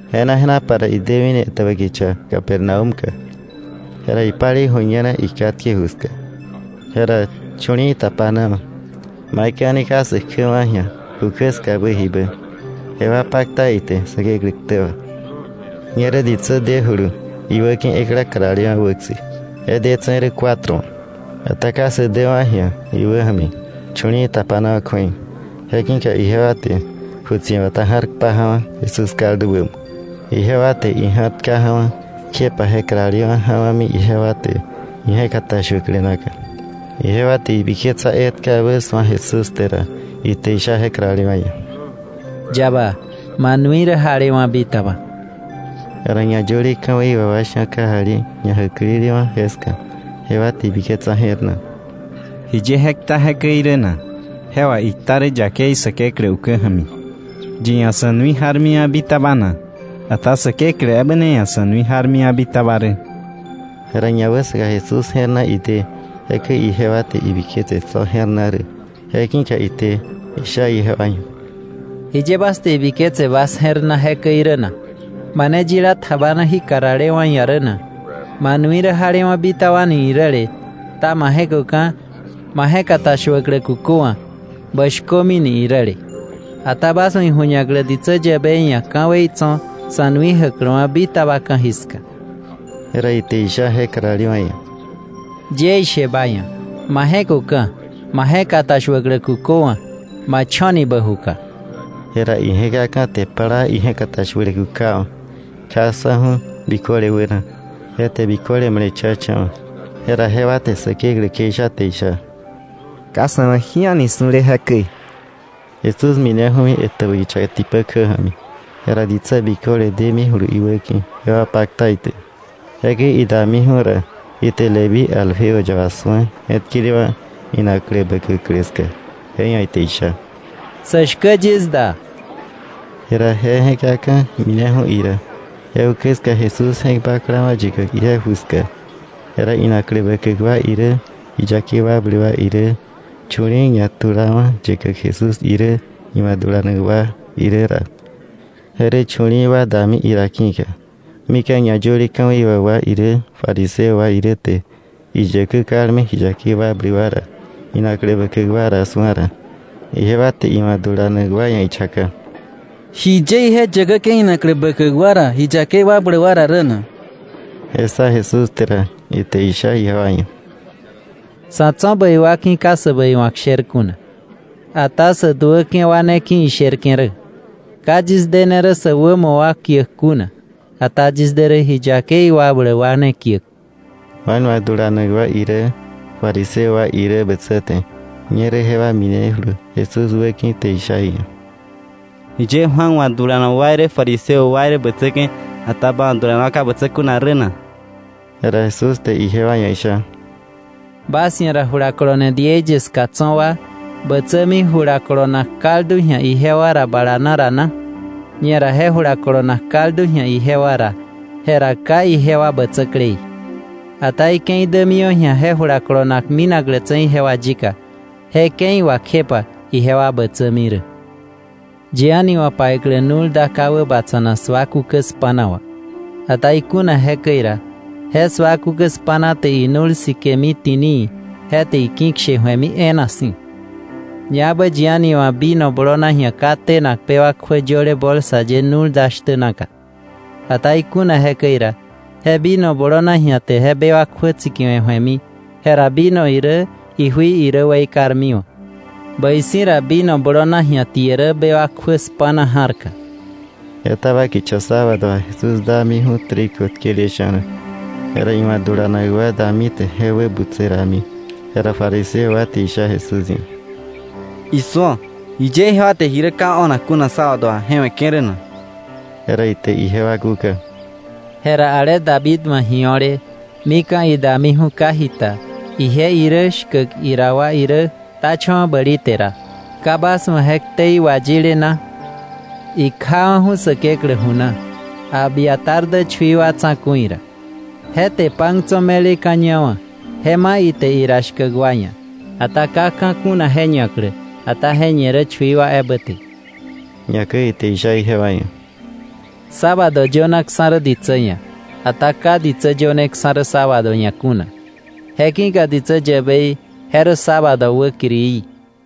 Je̱na je̱napa ra idemini etäbä kicha Capernaúm ka. Jera ipalei ju̱ñena ikatke ju ska. Jera chu̱li̱i̱ tapana wa̱, maikäi a̱ni ka sä kjäwa̱ ji̱a ju kjä skabä jibä, jewa pakta ite Säkeklä ktä wà. Ñerä ditsä dejulu iwäki̱ ekla karalewa̱ wäkse, je detse̱ rä cuatro wa̱. Ata ka sä däwa̱ ji̱a iwäja̱mi chu̱li̱i̱ tapanawa̱ kju̱ei, je ki̱ka ijewa te ju tsi̱bata ja̱r kpaja̱wa̱ Jesús kaldu wämo. Ijewa te ija̱r tkaja̱wa̱, kjepa je karalewa̱ ja̱wa̱mi ijewa te ije̱katashuäklä naka. Ijewa te ji biketsa etkabä su̱a Jesús te ra, ite isha je karalewa̱ ia̱: —Yaba, ma nui rä jalewa̱ bitaba. Jera ñayöle ka̱wei wà wa sha̱ kajali ñajäklelewa̱ jeska, jewa te ibiketsa je̱r na: “¿Jiye je kta jekäi rä na? Je wà ikta rä yakei Säkeklä ukä ja̱mi. ¿Yi ia̱ sa̱ nui jarmiwa̱ bitaba na? Ata Säkeklä ebä ne ia̱ sa̱ nui jarwa̱ bitaba rä.” Jera ñawäsaka Jesús je̱r na ide jekäi ijewa te ibiketse tso̱ je̱r na rä, je ki̱ka ite isha ijewa ia̱: —¿Jiye bas te ibiketse bas je̱r na jekäi rä na? ¿Mane yila tjabana jí karalewa̱ ia̱ rä na: ‘Ma nui rä jalewa̱ bitaba’ ni iräle, ta ‘ma je̱köka̱, ma je̱katashuäklä kuköwa̱, bä shkömi’ ni iräle? Ata bas wa̱ iju̱ñaklä ditsä yäbei ia̱ ka̱wei tso̱ sa̱ nui jäkläwa̱ bitaba ka̱jiska—jera ite isha je karalewa̱ ia̱—: —Yie ishe ba ia̱, ma je̱köka̱, ma je̱katashuäklä kuköwa̱, ma cho̱ni bä juka. Jera ije̱kaka̱ te plaa ije̱katashuäklä kukawa̱, kjaksa̱ju̱ biköle wäna. Je te biköle male̱cha̱cha̱wa̱. Jera jewa te Säkeklä kjeisha te isha: —Ka sa̱ wa̱ ji a̱ni su̱le jekäi. Jesús mineju̱ni etäbä kicha tipä kjä ja̱mi. Jera ditsä biköle demijulu iwäki̱. Jewa pakta ite. Jekäi idamiju̱ ra, ite Leví Alfeo yaba su̱a je̱tkelewa̱ inaklä bäkäklä ska, je ia̱ ite isha: —Sä shkä yis da. Jera je je̱kaka̱ mineju̱ ira. Je ukä ska Jesús je̱k baklawa̱ yäkäk ije ju ska. Jera inaklä bäkäk wa irä, ji yakei wakbläk wa irä chu̱li̱i̱ ñatulawa̱ yäkäk Jesús irä, iwa̱ dulanak wa irä ra, je rä chu̱li̱i̱ wa dami ira ki̱ka. Mika̱ ñayöle ka̱wei wà wa irä, fariseo wa irä te iyäkä kalme ji yakei wakbläk wa ra, inaklä bäkäk wa ra su̱a ra, ijewa te iwa̱ dulanak wa ia̱ ichaka: —¿Jiye ije yäkäke̱ inaklä bäkäk wa ra, ji yakei wakbläk wa ra rä na? Je ssa Jesús te ra, ite isha ijewa ia̱: —Sa̱ tso̱ bäi wa ki̱ ka sä bäiwa̱k sher kuna, ata sä duäke̱ wa ne ki̱ isherke̱ rä. Ka yis dene rä sä wämo wa kiäk kuna, ata yis de rä ji yakei wakbläk wa ne kiäk. Juan wa̱ dulanak wa irä fariseo wa irä bätsäte, ñerä jewa minejulu Jesús wäki̱ te isha iia̱: —¿Jiye Juan wa̱ dulanak wa irä fariseo wa wa̱ dulanak wa irä, bätsäke̱, ata ba wa̱ dulanak wa ka bätsä kuna rä na? Jera Jesús te ijewa ia̱ isha: —¿Bas ia̱ ra julakolone diei ye ska tso̱ wa bätsämi jula kolonak kaldu ji̱a ijewa ra bala na ra na? Ñera je jula kolonak kaldu ji̱a ijewa ra, jera ka ijewa bätsäklei. Ata ike̱i dämiwa̱ ji̱a je jula kolonak minaklätse̱ ijewa yika, je ke̱i wà kjepa ijewa bätsämi rä. Yi a̱ni wa̱ paiklä nu̱l da ka wäbatsa̱nak sua kukä spa̱na wà, ata ikuna jekäi ra, je sua kukä spa̱na te inu̱l sikemi ti̱nii, je te iki̱kshe ju̱emi e̱e̱na si̱. Ñaebä yi a̱ni wa̱ vino blonaji̱a ka tenak bewak kjuä yöle bolsa ye nu̱l da shtä naka. Ata ikuna jekäi ra, je vino blonaji̱a te bewak kjuä tsikiwe̱ ju̱emi, jera vino irä ijui irä weikarmiwa̱. Bäi si̱ ra vino blonaji̱a tie rä bewak kjuä spa̱na ja̱rka. Etaba kicha sábado wà, Jesús damiju̱ trigo tkele sha̱na, jera iwa̱ dulanak wa dami te je wä butse rami. Jera fariseo wa te isha Jesús ia̱: —Isu̱o. ¿Jiye ijewa te ji rä ka o̱nak kuna sábado wà, je weke̱ rä na? Jera ite ijewa kúka: —Jera ale David wa̱ ji o̱le, mika̱ idamiju̱ ka jita, ije irä shkäk ira wa irä, ktacha̱wa̱ bäli te ra, ¿ka bas wa̱ je ktei wayile na? Ikjawa̱ju̱ Säkeklä ju na, Abiatar dä chui wa tsa̱ku̱i ra. Je te pan tso̱ me̱leka̱ ñawa̱, je ma̱ ite ira shkäk wa ia̱. Ata ka ka̱ kuna je ñaklä, ata je ñe rä chui wa ebä te. Ñakäi ite isha ijewa ia̱: —Sábado yönaksa̱ rä ditsä ia̱, ata ka ditsä yöneksa̱ rä sábado ia̱ kuna. Je ki̱ka ditsä yäbei, je rä sábado wäkirií.